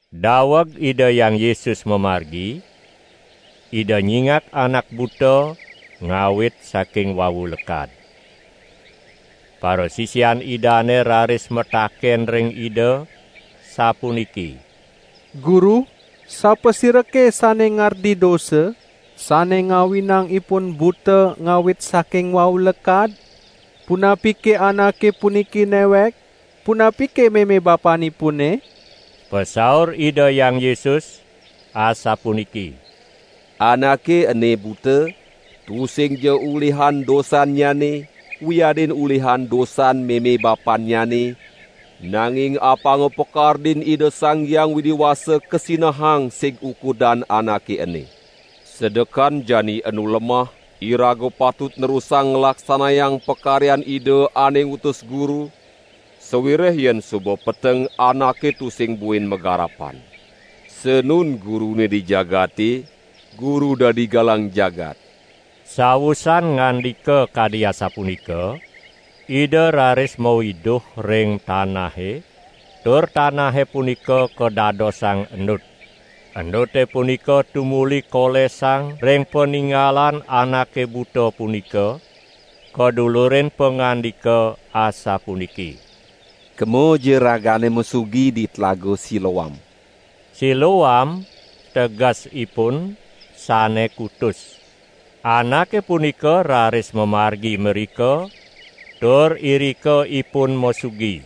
Daweg Ida Hyang Yesus mamargi, Ida nyingak anak buta ngawit saking wau lekad. Parasisian Idane raris mataken ring Ida sapuniki: "Guru, sapasirake sane ngardi dosa sane ngawinang ipun buta ngawit saking wau lekad, punapike anake puniki newek, punapike meme bapanipune?" Pasaur Ida Hyang Yesus asapuniki: "Anake ene buta, tusingja ulihan dosannyane, wiadin ulihan dosan meme bapannyane, nanging apanga pakardin Ida Sang Hyang Widi Wasa kasinahang sig ukudan anake ene. Sedekan jani enu lemah iraga patut nerusang nglaksanayang pakaryan Ida ane ngutus Guru, sawireh yen suba peteng anake tusing buin magarapan. Sanun Gurune di jagate, Guru dadi galang jagat." Sawusan ngandika kadi asapunika, Ida raris mawiduh ring tanahe tur tanahe punika kadadosang endut. Endute punika tumuli kolesang ring paningalan anake buta punika, kadulurin pangandika asapuniki: "Kemaja ragane masugi di Tlaga Siloam!" (Siloam tegesipun: Sane kutus.) Anake punika raris mamargi mrika tur irika ipun masugi.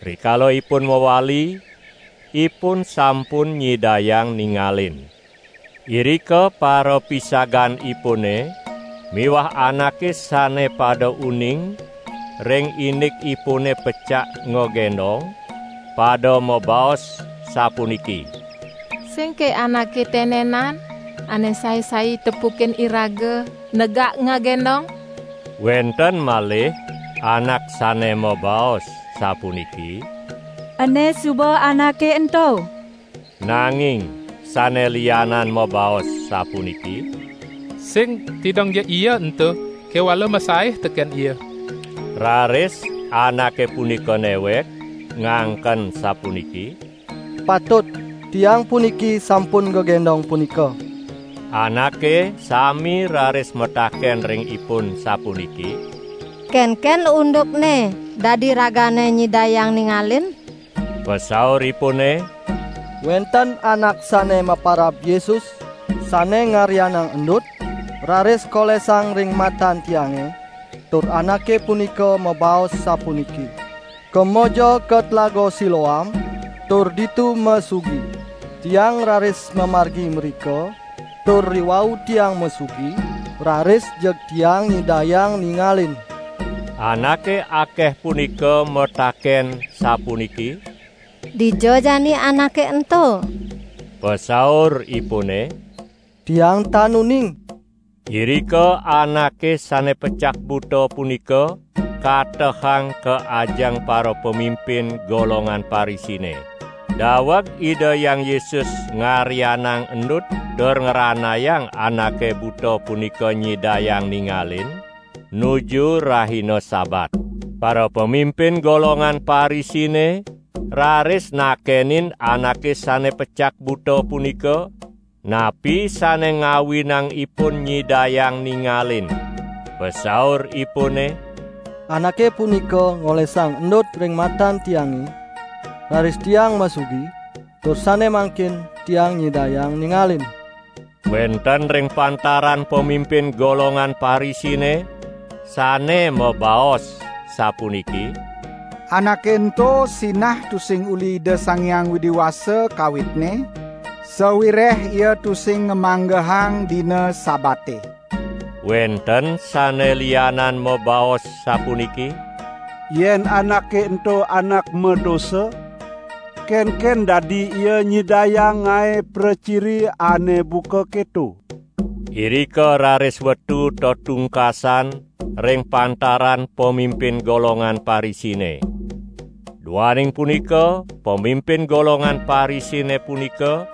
Rikala ipun mawali, ipun sampun nyidayang ningalin. Irika parapisaganipune miwah anake sane pada uning ring indikipune pecak ngagendong, pada mabaos sapuniki: "Singke anake tenenan ane sai-sai tepukin iraga negak ngagendong?" Wenten malih anak sane mabaos sapuniki: "Ene suba anake ento!" Nanging sane lianan mabaos sapuniki: "Sing, tidongja ia ento, kewala masaih teken ia!" Raris anake punika newek ngangken sapuniki: "Patut, tiang puniki sampun gegendong punika!" Anake sami raris mataken ring ipun sapuniki: "Kenken undukne dadi ragane nyidayang ningalin?" Pasauripune: "Wenten anak sane maparab Yesus, sane ngaryanang endut, raris kolesang ring matan tiange tur Anake punika mabaos sapuniki: 'Kemaja ka Tlaga Siloam, tur ditu masugi.' Tiang raris mamargi mrika tur riwau Tiang masugi, raris jeg tiang nyidayang ningalin!" Anake akeh punika mataken sapuniki: "Dija jani Anake ento?" Pasauripune: "Tiang tan uning." Irika anake sane pecak buta punika katehang ka ajeng parapamimpin golongan Parisine. Daweg Ida Hyang Yesus ngaryanang endut tur ngranayang anake buta punika nyidayang ningalin, nuju rahina Sabat. Parapamimpin golongan Parisine raris nakenin anake sane pecak buta punika, napi sane ngawinang ipun nyidayang ningalin. Pasauripune: "Anake punika ngolesang endut ring matan tiange, raris tiang masugi, tur sane mangkin tiang nyidayang ningalin." Wenten ring pantaran pamimpin golongan Parisine sane mabaos sapuniki: "Anake ento sinah tusing uli Ida Sang Hyang Widi Wasa kawitne, sawireh Ia tusing ngamanggehang dina Sabate." Wenten sane lianan mabaos sapuniki: "Yen anake ento Anak madosa, kenken dadi Ia nyidayang ngae praciri ane buka keto?" Irika raris wetu tetungkasan ring pantaran pamimpin golongan Parisine. Duaning punika pamimpin golongan Parisine punika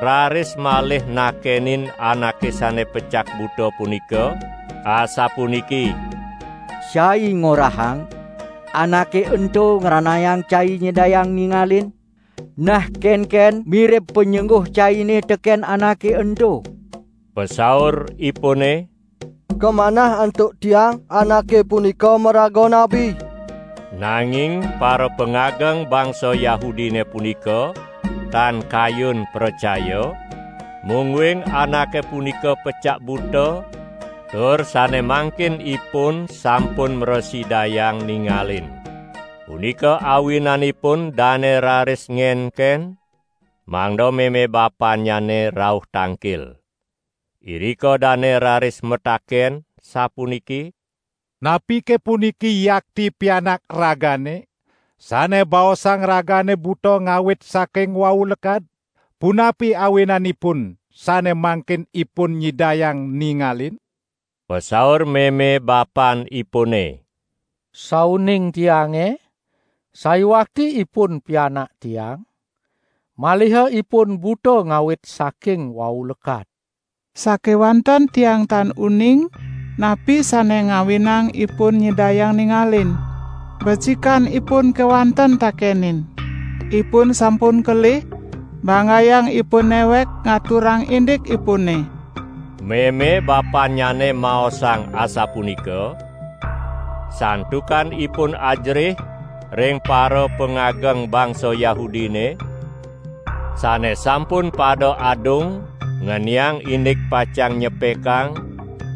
raris malih nakenin anake sane pecak buta punika, asapuniki: "Cai ngorahang, Anake ento ngranayang cai nyidayang ningalin. Nah kenken mirib panyengguh caine teken Anake ento?" Pasauripune: "Kamanah antuk tiang Anake punika maraga nabi!" Nanging parapangageng bangsa Yahudine punika tan kayun pracaya, mungguing anake punika pecak buta tur sane mangkin ipun sampun mrasidayang ningalin. Punika awinanipun dane raris ngenken, mangda meme bapannyane rauh tangkil. Irika dane raris mataken sapuniki: "Napike puniki yakti pianak ragane, sane baosang ragane buta ngawit saking wau lekad? Punapi awinanipun sane mangkin ipun nyidayang ningalin?" Pasaur meme bapanipune: "Sauning tiange, sayuakti ipun pianak tiang, maliha ipun buta ngawit saking wau lekad. Sakewanten tiang tan uning, napi sane ngawinang ipun nyidayang ningalin. Becikan ipun kewanten takenin; ipun sampun kelih, banggayang ipun newek ngaturang indikipune!" Meme bapannyane maosang asapunika, santukan ipun ajerih ring parapangageng bangsa Yahudine, sane sampun pada adung ngeniang indik pacang nyepekang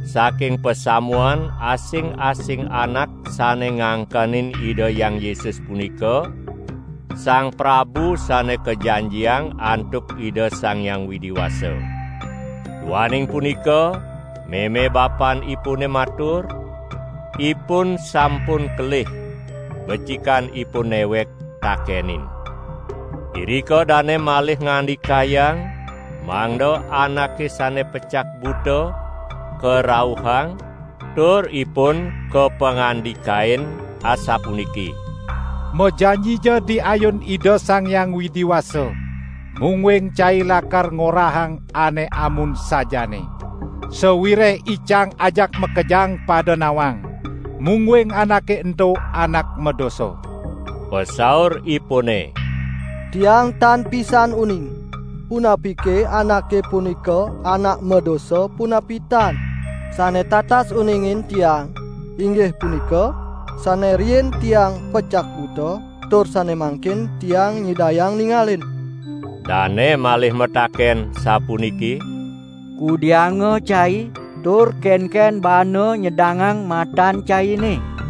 saking pasamuan asing-asing anak sane ngangkenin Ida Hyang Yesus punika Sang Prabu Sane Kajanjiang antuk Ida Sang Hyang Widi Wasa. Duaning punika meme bapanipune matur: "Ipun sampun kelih, becikan ipun newek takenin." Irika dane malih ngandikayang mangda anake sane pecak buta karauhang tur ipun kapangandikain asapuniki: "Majanjija di ayun Ida Sang Hyang Widi Wasa, mungguing cai lakar ngorahang ane amun sajaane! Sawireh icang ajak makejang pada nawang, mungguing Anake ento Anak madosa!" Pasauripune: "Tiang tan pisan uning, punapike Anake punika Anak madosa, punapi tan. Sane tatas uningin tiang, inggih punika: sane riin tiang pecak buta, tur sane mangkin tiang nyidayang ningalin!" Dane malih mataken sapuniki: "Kudianga cai tur kenken baana nyedangang matan caine?"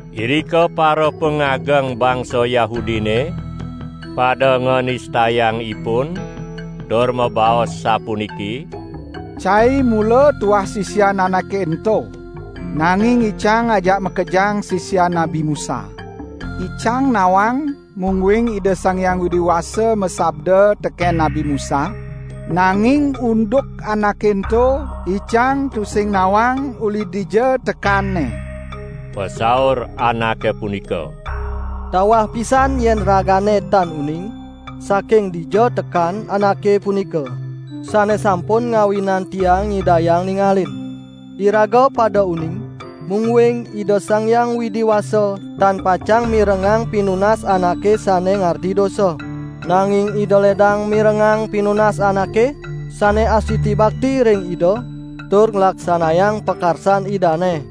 Irika parapangageng bangsa Yahudine pada nganistayang ipun tur mabaos sapuniki: "Cai mula tuah sisian Anake ento! Nanging icang ajak makejang sisian Nabi Musa! Icang nawang, mungguing Ida Sang Hyang Widi Wasa masabda teken Nabi Musa; nanging unduk Anake ento, icang tusing nawang uli dija tekanNe." Pasaur anake punika: "Tawah pisan yen ragane tan uning saking dija tekan Anake punika, sane sampun ngawinang tiang nyidayang ningalin. Iraga pada uning, mungguing Ida Sang Hyang Widi Wasa tan pacang mirengang pinunas anake sane ngardi dosa. Nanging Ida ledang mirengang pinunas anake sane astiti bakti ring Ida tur nglaksanayang pakarsan Idane.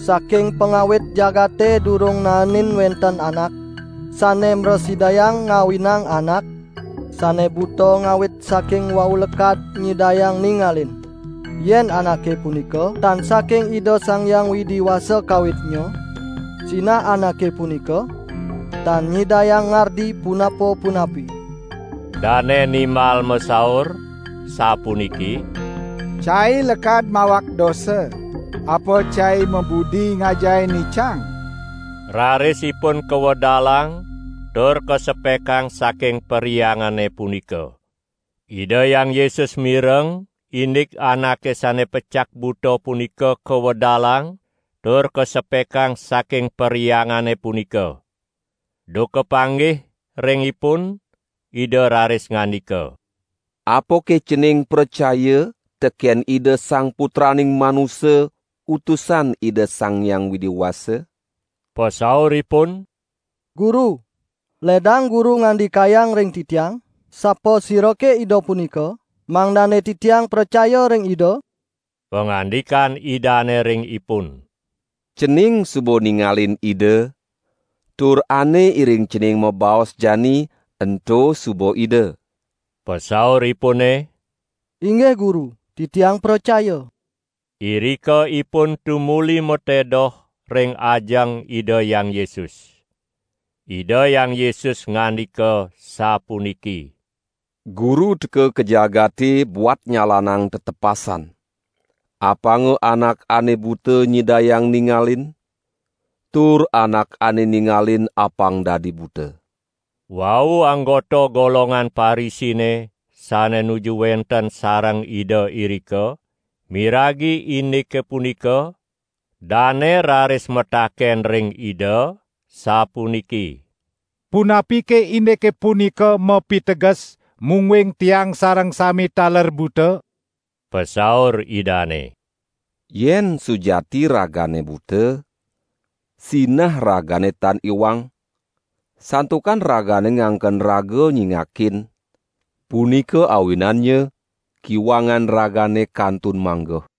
Saking pangawit jagate durung naenin wenten anak sane mrasidayang ngawinang anak sane buta ngawit saking wau lekad nyidayang ningalin. Yen Anake punika tan saking Ida Sang Hyang Widi Wasa kawitnya, sinah Anake punika tan nyidayang ngardi punapa-punapi." Dane nimbal masaur, sapuniki: "Cai lekad mawak dosa, apa cai mabudi ngajahin icang?" Raris ipun kawedalang tur kasepakang saking perhyangane punika. Ida Hyang Yesus mireng indik anake sane pecak buta punika kawedalang tur kasepakang saking perhyangane punika. Duk kapanggih ring ipun Ida raris ngandika: "Apake cening pracaya teken Ida Sang Putraning Manusa Utusan Ida Sang Hyang Widi Wasa?" Pasauripun: "Guru, ledang Guru ngandikayang ring titiang sapasirake Ida punika, mangdane titiang pracaya ring Ida?" Pangandikan Idane ring ipun: "Cening suba ningalin Ida, tur ane iring cening mabaos jani, ento suba Ida!" Pasauripune: "Inggih Guru, titiang pracaya." Irika ipun tumuli matedoh ring ajeng Ida Hyang Yesus. Ida Hyang Yesus ngandika sapuniki: "Guru teka ka jagate buat nyalanang tetepasan: apanga anak ane buta nyidayang ningalin, tur anak ane ningalin apang dadi buta!" Wau anggota golongan Parisine sane nuju wenten sareng Ida irika, miragi indike punika, dane raris mataken ring Ida sapuniki: "Punapike indike punika mapiteges, mungguing tiang sareng sami taler buta?" Pasaur Idane: "Yen sujati ragane buta, sinah ragane tan iwang, santukan ragane ngangken raga nyingakin, punika awinannya kiwangan ragane kantun manggeh!"